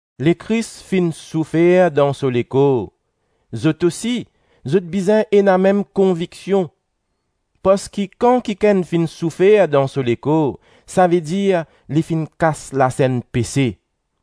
Lekris finn soufer dan so lekor; zot osi, zot bizin ena mem konviksion, parski kan kikenn finn soufer dan so lekor, savedir li finn kas lasenn pese,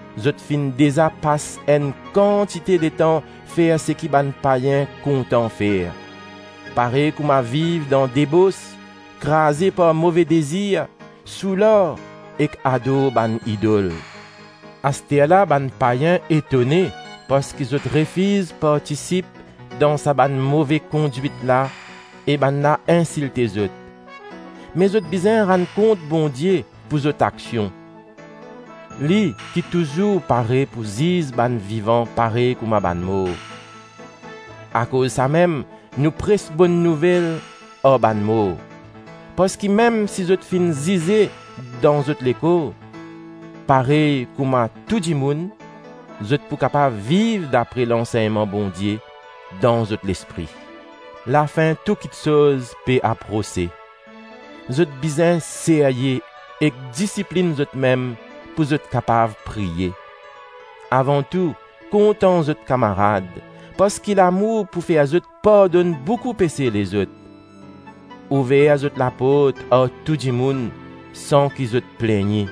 Zot finn deza pas enn kantite letan fer seki bann payin kontan fer: parey kouma viv dan debos, kraze par move dezir, soular ek ador bann idol. Asterla bann payin etone parski zot refiz partisip dan sa bann move kondwit la e bannla insilte zot. Me zot bizin rann kont Bondie pou zot aksion, li ki touzour pare pou ziz bann vivan parey kouma bann mor. Akoz samem nou pres Bonn Nouvel ar bann mor, parski mem si zot finn zize dan zot lekor parey kouma tou dimoun, zot pou kapav viv dapre lansegnman Bondie dan zot lespri. Lafin tou kitsoz pe aprose. Zot bizin serye ek disiplinn zotmem pou zot kapav priye. Avan tou, kontan zot kamarad, parski lamour pou fer zot pardonn boukou pese lezot. Ouver zot laport ar tou dimoun san ki zot plegne.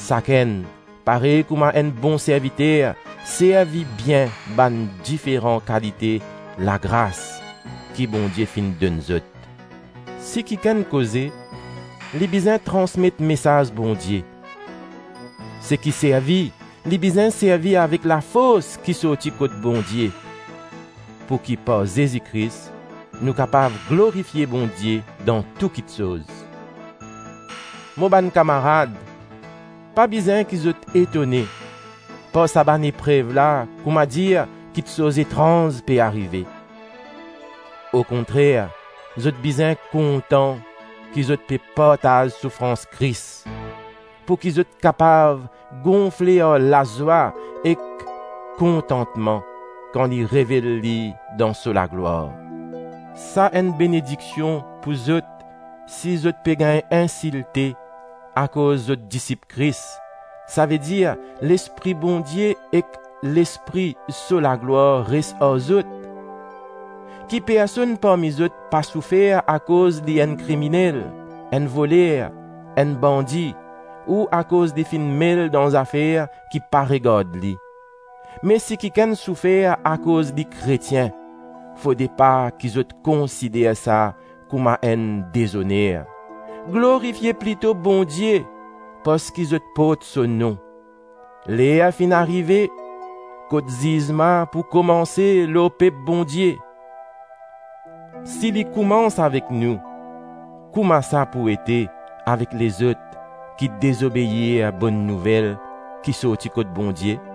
Sakenn, parey kouma enn bon serviter, servi bien bann diferan kalite lagras ki Bondie finn donn zot. Si kikenn koze, li bizin transmet mesaz Bondie; seki servi, li bizin servi avek lafors ki sorti kot Bondie, pouki par Zezi Kris, nou kapav glorifie Bondie dan tou kiksoz. Mo bann kamarad, pa bizin ki zot etone par sa bann eprev la kouma dir kiksoz etranz pe arive. Okontrer, zot bizin kontan ki zot pe partaz soufrans Kris, pouki zot kapav gonfle ar lazwa ek kontantman kan li revel li dan so laglwar. Sa enn benediksion pou zot si zot pe gagn insilte akoz zot disip Kris, savedir Lespri Bondie ek Lespri so laglwar res ar zot. Ki personn parmi zot pa soufer akoz li enn kriminel, enn voler, enn bandi ou akoz li finn mel dan zafer ki pa regard li. Me si kikenn soufer akoz li Kretien, fode pa ki zot konsider sa kouma enn dezoner; glorifie plito Bondie parski zot port so nom. Ler finn arive kot zizman pou koumanse lor pep Bondie; si li koumans avek nou, kouma sa pou ete avek lezot ki dezobeir Bonn Nouvel ki sorti kot Bondie?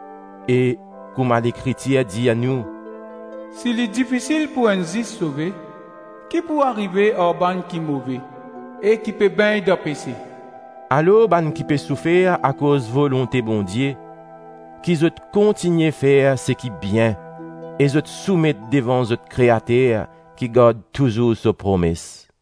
E kouma Lekritir dir nou: “Si li difisil pou enn zis sove, ki pou arive ar bann ki move e ki pe begn dan pese?” Alor bann ki pe soufer akoz volonte Bondie, ki zot kontigne fer seki bien e zot soumet devan zot Kreater ki gard touzour so promes.